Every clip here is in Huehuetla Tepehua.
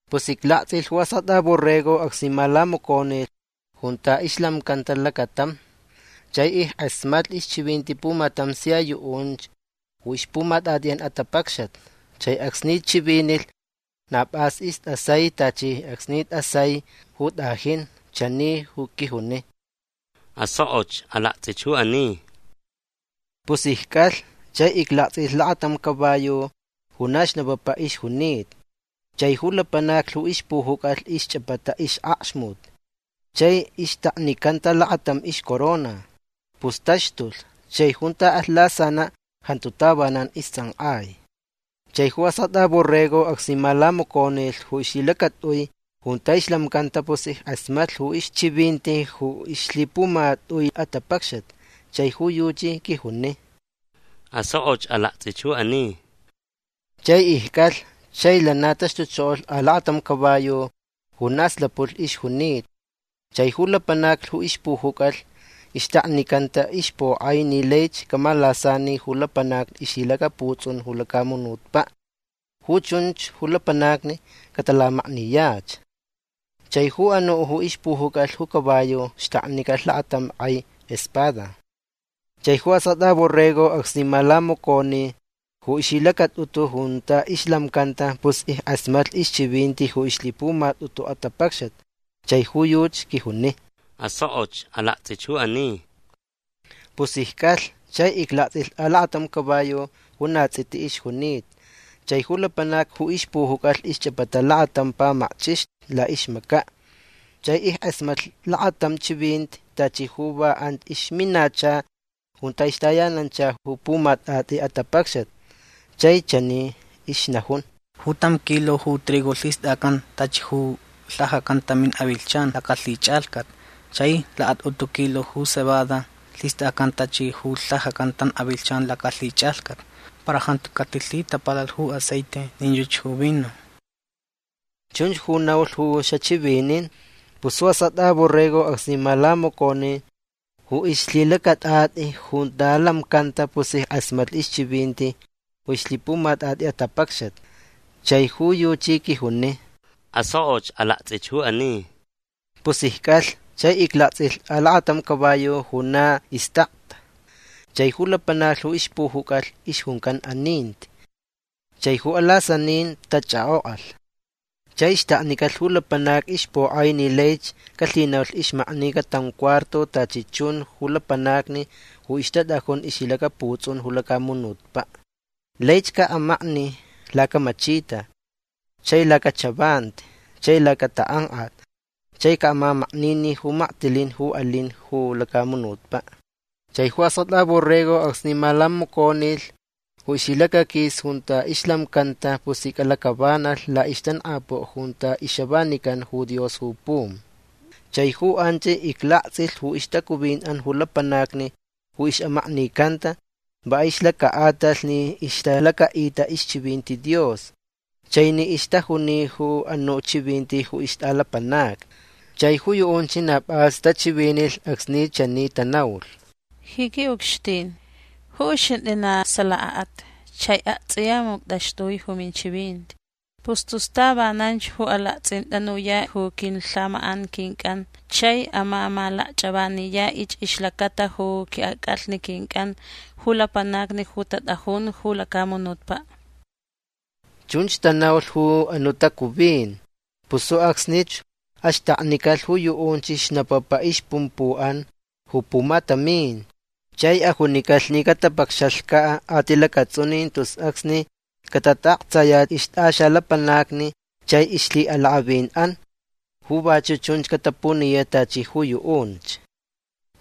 Pus iclaktsʼilh ju Askʼatʼa Borrego acsni malamaconi junta ixlamcanta lacatam. Chai ickʼasmatlh ixchivinti pumatam sia yuʼunch ju ixpumatʼatʼiʼan atapacxat. Chai acsni chivinilh na pʼas istʼasai tachi acsnich tʼasai ju tʼajin. Chani ju quijuni: ―Asokʼoch. Alaktsʼich ju ani. Pus icʼalh. Chai iclaktsʼilh lakatam caballo ju na xnapapa ixjunita. Chai ju lapanac ju ixpujucʼalh ixchʼapata ixʼakxmuti chai ixtaknicanta lakatam ixcorona. Pus taxtulh. Chai junta alh lasanaʼ jantu tavanan istsʼankʼai. Chai ju Askʼatʼa Borrego acsni malamaconilh ju ixlhilacatʼui junta ixlamcanta pus ickʼasmatlh ju ixchivinti ju ixlhipumatʼui atapacxat. Chai ju yuchi quijuni: ―Asokʼoch. Alaktsʼich ju ani. Chai icʼalh. Chai lana taxtuchokolh alakatam caballo ju na slapulh ixjunita. Chai ju lapanac ju ixpujucʼalh ixtaknicanta ixpokʼai ni laich camalasani ju lapanacni ixlhilacaputsʼun ju lacamunutpaʼ. Ju chunch ju lapanacni catalamakniyach. Chai ju anuʼ ju ixpujucʼalh ju caballo xtaknicalh lakatam kʼai espada. Chai ju Askʼatʼa Borrego acsni malamaconi ju ixlhilacatʼutu junta ixlamcanta pus ickʼasmatlh ixchivinti ju ixlhipumatʼutu atapacxat. Chai ju yuchi quijuni: ―Asokʼoch. Alaktsʼich ju ani. Pus icʼalh. Chai iclaktsʼilh alakatam caballo ju na tsʼiti ixjunita. Chai ju lapanac ju ixpujucʼalh ixchʼapata lakatam pamakchʼixni laʼixmacaʼ. Chai ickʼasmatlh lakatam chivinti tachi ju va anch ixminacha junta ixtayananchalh ju pumatʼatʼi atapacxat. Chai chani ixnajun: ―Ju tam kilo ju trigo lhistʼacan tachi ju lhajacan tamin avilhchan lacalhichʼalhcat. Chai lakatʼutu kilo ju cebada lhistʼacan tachi ju lhajacan tam avilhchan lacalhichʼalhcat. Para jantu catilhitapalalh ju aceite nin yuchi ju vino. ―Chunch ju naulh ju xachivinin. Pus ju Askʼatʼa Borrego acsni malamaconi ju ixlhilacatʼatʼi junta lamcanta pus ickʼasmatlh ixchivinti ju ixlhipumatʼatʼi atapacxat. Chai ju yuchi quijuni: ―Asokʼoch. Alaktsʼich ju ani. Pus icʼalh. Chai iclaktsʼilh alakatam caballo ju na istakta. Chai ju lapanac ju ixpujucʼalh ixjuncan aninti. Chai ju alasaninin tachʼakʼokʼalh. Chai xtaknicalh ju lapanac ixpokʼai ni laich calhinaulh ixmaknica tam cuarto tachi chun ju lapanacni ju ixtatʼajun ixlhilacaputsʼun ju lacamunutpaʼ. Laich caʼamakni lacamachita chai lacachavanti chai lacatakʼankʼat chai caʼamamakninin ju maktilin ju alin ju lacamunutpaʼ. Chai ju Askʼatʼa Borrego acsni malamaconilh ju ixlhilacaquis junta ixlamcanta pus icʼalacʼavanalh laʼixtankʼapuʼ junta ixavanican ju Dios ju pum. Chai ju anch iclaktsʼilh ju ixtacuvinʼan ju lapanacni ju ixʼamaknicanta va ixlacaʼatalh ni ixtalacaʼita ixchivinti Dios chai ni ixtajuni ju anuʼ chivinti ju ixtʼalapanacni. Chai ju yuʼunch na pʼas tachivinilh acsni chani tanaulh: ―Ji quiʼucxtin ju uxintʼi na salakaʼat. Chai aktsʼiya muctʼaxtʼui ju minchivinti. Pus tus tavananch ju alaktsʼintʼanuyaʼ ju quilhamakʼan quincʼan chai amamalakchʼavaniyaʼich ixlacata ju quinʼacʼalhni quincʼan ju lapanacni ju tatʼajun ju lacamunutpaʼ. ―Chunch tanaulh ju anuʼ tacuvin. Pus ju acsnich axtaknicalh ju yuʼunch xnapapa ixpumpuʼan ju pumatamin. Chai ajunicalh ni catapacxalhcaʼ atilacatsʼunin tus acsni catataʼaktsayach ixtʼaxalapanacni chai ixlhiʼalakʼavinʼan ju vachuʼ chunch catapuniyaʼ tachi ju yuʼunch.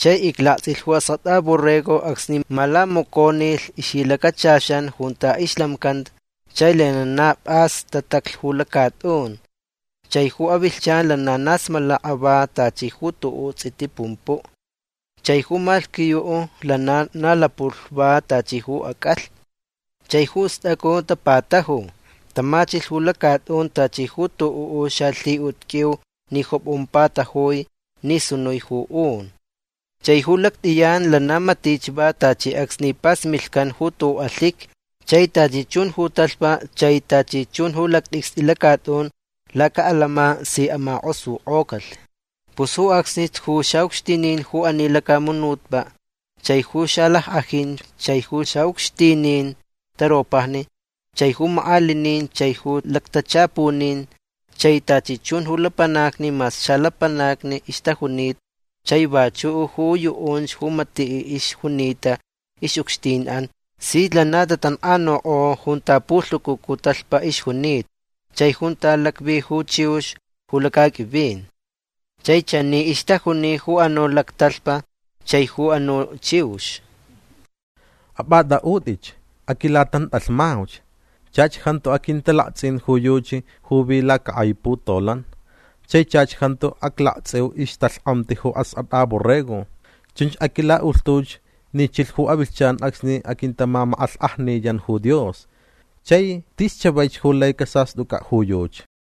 Chai iclaktsʼilh ju Askʼatʼa Borrego acsni malamaconilh ixlhilacachaxan junta ixlamcanta chai lana na pʼas tataclh ju lacatʼun. Chai ju avilhchan lana na smalaka va tachi ju tuʼuʼ tsʼiti pumpuʼ. Chai ju malhquiyuʼ lana na lapulh va tachi ju acʼalhni. Chai ju stʼacu tapataju. Tamachilh ju lacatʼun tachi ju tuʼuʼ xalhiʼut qʼuiu ni jopʼon patajui ni sunui ju un. Chai ju lactʼiyan lana matich va tachi acsni pasmilhcan ju tuʼuʼ alhiqui. Chai tachi chun ju talhpa chai tachi chun ju lactʼicstʼi lacatʼun lacaʼalama si amakʼosukʼocalh. Pus ju acsnich ju xaʼucxtinin ju ani lacamunutpaʼ chai ju xalackʼajinch chai ju xaʼucxtinin taropajni chai ju makʼalinin chai ju lactachapunin chai tachi chun ju lapanacni mas xalapanacni ixtajunita chai vachuʼ ju yuʼunch ju matiʼ ixjunita ixʼucxtinʼan sich lana tatankʼanukʼo junta pulhucucu talhpa ixjunita chai junta lacvi ju chiux ju lacaqʼuivin. Chai chani ixtajuni ju anuʼ lactalhpa chai ju anuʼ chiux: ―Apʼatʼaʼutʼitch. Aquilatantʼalhmauch. Chach jantu aquintalaktsʼin ju yuchi ju vi lacakʼai putolan. Chai chach jantu aclaktsʼiu ixtalhkʼamti ju Askʼatʼa Borrego. Chunch aquilaʼulhtuch ni chilh ju avilhchan acsni aquintamamakʼalhkʼajniyan ju Dios. Chai tis chavaich ju lai casastʼucʼaʼ ju yuchi.